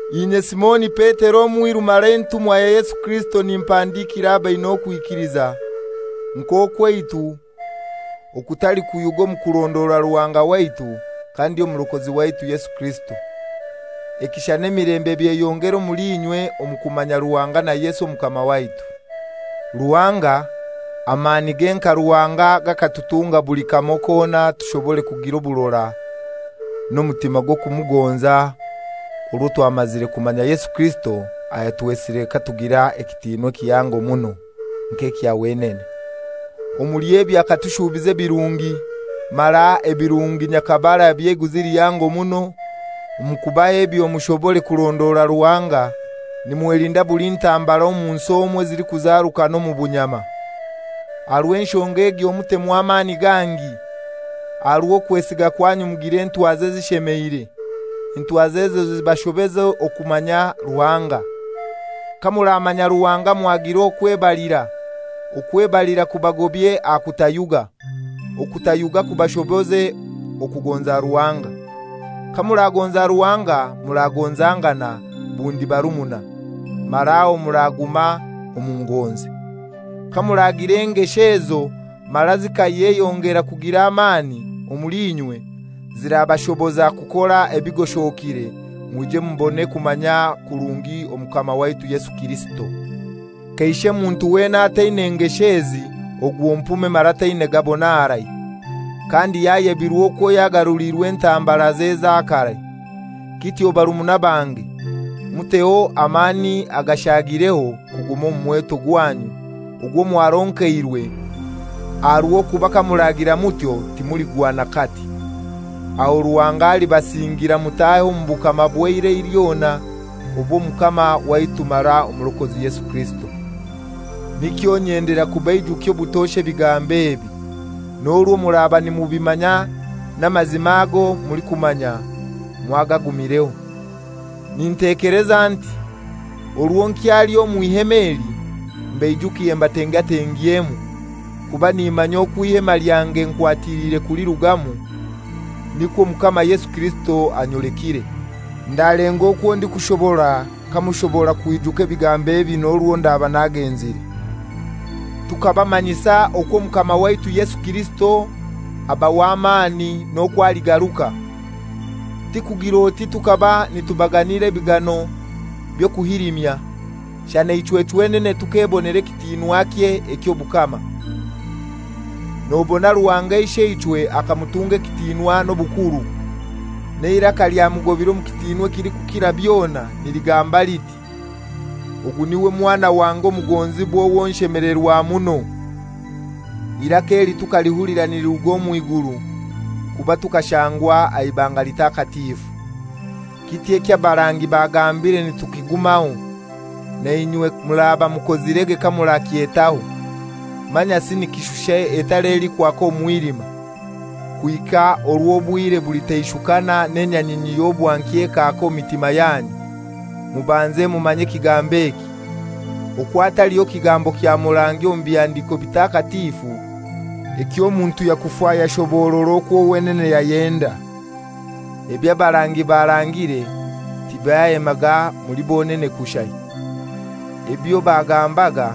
Inye Simoni Petero, omwiru mara entumwa ya Yesu Kirisito, nimpandikira abaina okwikiliza nk'okwaitu okutalikuyuga omu kurondora Ruhanga waitu kandi Omurokozi waitu Yesu Kirisito. Ekisha n'emilembe byeyongere omuli inywe omu kumanya Ruhanga na Yesu Omukama waitu. Ruhanga, amanige nka Ruhanga gakatutunga buli kamoi kona tushobore kugir'oburora n'omutima gw'okumugonza orwo twamazire kumanya Yesu Kirisito ayatwesire katugira ekitinwa ekihango muno nk'ekya wenene. Omuli ebyo akatushuubiza ebirungi, mara ebirungi nyakabara eby'eiguzi lihango muno. Omu kuhaba ebyo mushobore kurondora Ruhanga, nimwelinda buli ntambara omu nsi omu ezilikuzarukana omu bunyama. Aha rw'enshonga egyo mutemu amani gangi, aha rw'okwesiga kwanyu mugire entwaza ezishemeire, entwaza ezo zibashoboze okumanya Ruhanga. Kamuramanya Ruhanga mwagira okwebalira, okwebalira kubagobye aha kutayuga, okutayuga kubashoboze okugonza Ruhanga. Kamuragonza Ruhanga muragonzangana bundi barumuna, mara aho muraguma omu ngonzi. Kamuragira engesho ezo mara zikeyongera kugira amani omuli inywe, zirabashoboza kukora ebigoshokire, mwije mubone kumanya kurungi Omukama waitu Yesu Kirisito. Kaishe muntu wena ataina ngesho ezi ogwo mpume mara taina gabona harai, kandi yayebirwe okwo yagaruliirwe entambaraze eza karai. Kityo barumuna bange, muteho amani agashaagireho kuguma omu mweto gwanyu ogwo mwaronkeirwe, aha r'okuba kamuragira mutyo timuligwa n'akati. Aho Ruhanga alibasingira mutahe omu bukama bw'eirai lyona obw'Omukama waitu mara Omurokozi Yesu Kirisito. Nikyo nyendera kubaijukya obutosha ebigambo ebi, n'orwo muraba nimubimanya n'amazima ago mulikumanya mwagagumireho. Nintekeleza nti, orwo nkyali omw'ihema eli, mbaijukye mbatengatengyemu. Kuba nimanya okwo eihema lyange nkwatiliire kulirugamu, nikwo Omukama Yesu Kirisito anyolekire. Ndalenga okwo ndikushobora kamushobora kwijuka ebigambo ebi n'orwo ndaba nagenzire. Tukabamanyisa okwo Omukama waitu Yesu Kirisito aba w'amani n'okwo aligaruka. Tikugir'oti tukaba nitubaganira ebigano by'okuhilimya, shana ichwe chwenene tukebonera ekitinwakye eky'obukama. Nobona Ruhanga Isheichwe akamutunga ekitinwa n'obukuru, n'eiraka lyamugobire omu kitinwa ekilikukira byona, niligamba liti, «Ogu niwe Mwana wange omugonzibwa owo nshemelerwa muno.» Eiraka eli tukalihulira niliruga omw'iguru, kuba tukashangwa aha ibanga litakatifu. Kityo eky'abarangi bagambire nitukigumaho. Nainywe muraba mukozirege kamurakyetaho, manyasi nikishusha etara elikwaka omu mwilima, kuhika orw'obwire bulitaishukana n'enyanyinyi y'obwankya ekaaka omu mitima yanyu. Mubanze mumanye ekigambo eki: Okwo hataliho kigambo kya murangi omu Bihandiko Bitakatifu eky'omuntu yakufa yashoborora okwo wenene yayenda. Eby'abarangi barangire tibyayemaga muli bonene kushai. Ebyo bagambaga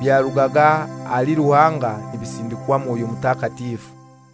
byarugaga ahali Ruhanga nibasindikwa Mwoyo Mutakatifu.